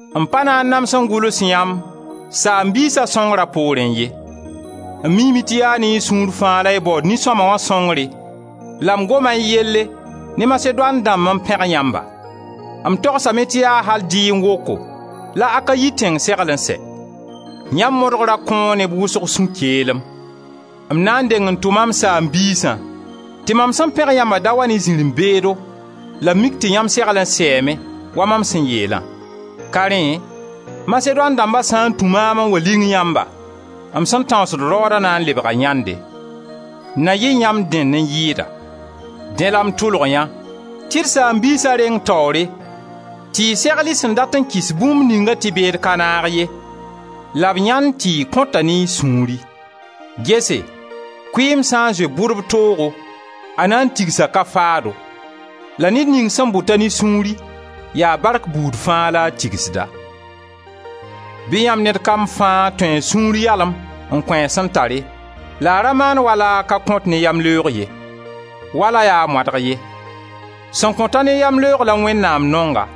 M pa na n nams n gʋls yãmb saam-biisa sõngra poorẽ ye. M miime tɩ yaa ne y sũur fãa la y baood nin-sõma wã sõngre la m goma y yelle ne Masedoan dãmb n pẽg yãmba; m togsame tɩ yaa al dɩẽ woko la Akayi tẽng segl n sɛ. Yãmb modgra kõo neb wʋsg sũ-keelem. M na n deng n tʋma m saam-biisã tɩ mam sẽn pẽg yãmba da wa yɩ zirẽ-beedo la b mik tɩ yãmb segl n sɛɛme wa mam sẽn yeelã. Ka rẽ Masedoan dãmba sã n tũ maam n wa ling yãmba, m sẽn tãoosd raooda na n lebga yãnde; na yɩ yãmb dẽnd n yɩɩda. Dẽ la m tʋlg yã tɩ d saam-biisa reng taoore tɩ y segl y sẽn dat n kɩs bũmb ningã tɩ beed ka naag ye, la b yãend tɩ y kõta ne y sũuri. Gese, kʋɩɩm sã n zoe bʋdb toogo, a na n tigsa ka-faado la ned ning sẽn bʋta ne sũuri yaa bark buud fãa la a tigsda. Bɩ yãmb ned kam fãa tũ a sũur yalem n kõ a sẽn tare la a ra maan wala a ka kõt ne yamleoog ye, wala yaa moadeg ye. Sẽn kõt-a ne yamleoog la Wẽnnaam nonga.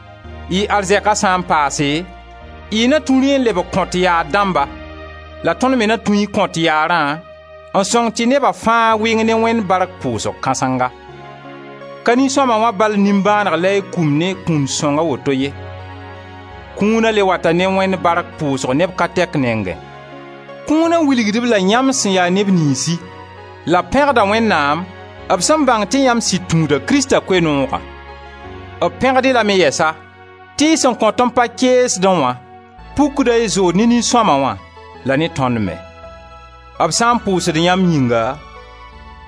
Y arzɛka sã n paase, y na tũ rẽ n lebg kõt yaar dãmba, la tõnd me na tũ y kõt yaarã n sõng tɩ neba fãa wɩng ne Wẽnd bark pʋʋsg kãsenga. Ka nin-sõma wã bal nimbãaneg la y kũmd ne kũun-sõng a woto ye, kũuna le wata ne Wẽnd bark pʋʋsg neb ka tɛk nengẽ. Kũuna wilgd-b-la yãmb sẽn ya neb niynsi la b pẽgda Wẽnnaam b sẽn bãng tɩ yãmb sɩd tũuda Krista Koe-noogã. B pẽgd-y lame yɛsa tɩ y sẽn kõt n pa keesdẽ wã, pukda y zood ne nin-sõma wã la ne tõnd me. B sã n pʋʋsd yãmb yĩnga,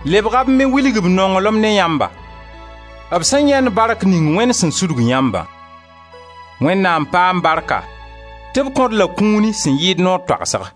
lebga b me wilg b nonglem ne yãmba, b sẽn yãend bark ning Wẽnd sẽn sudg yãmbã. Wẽnnaam paam barka tɩ b kõ-d la kũuni sẽn yɩɩd noor toagsg!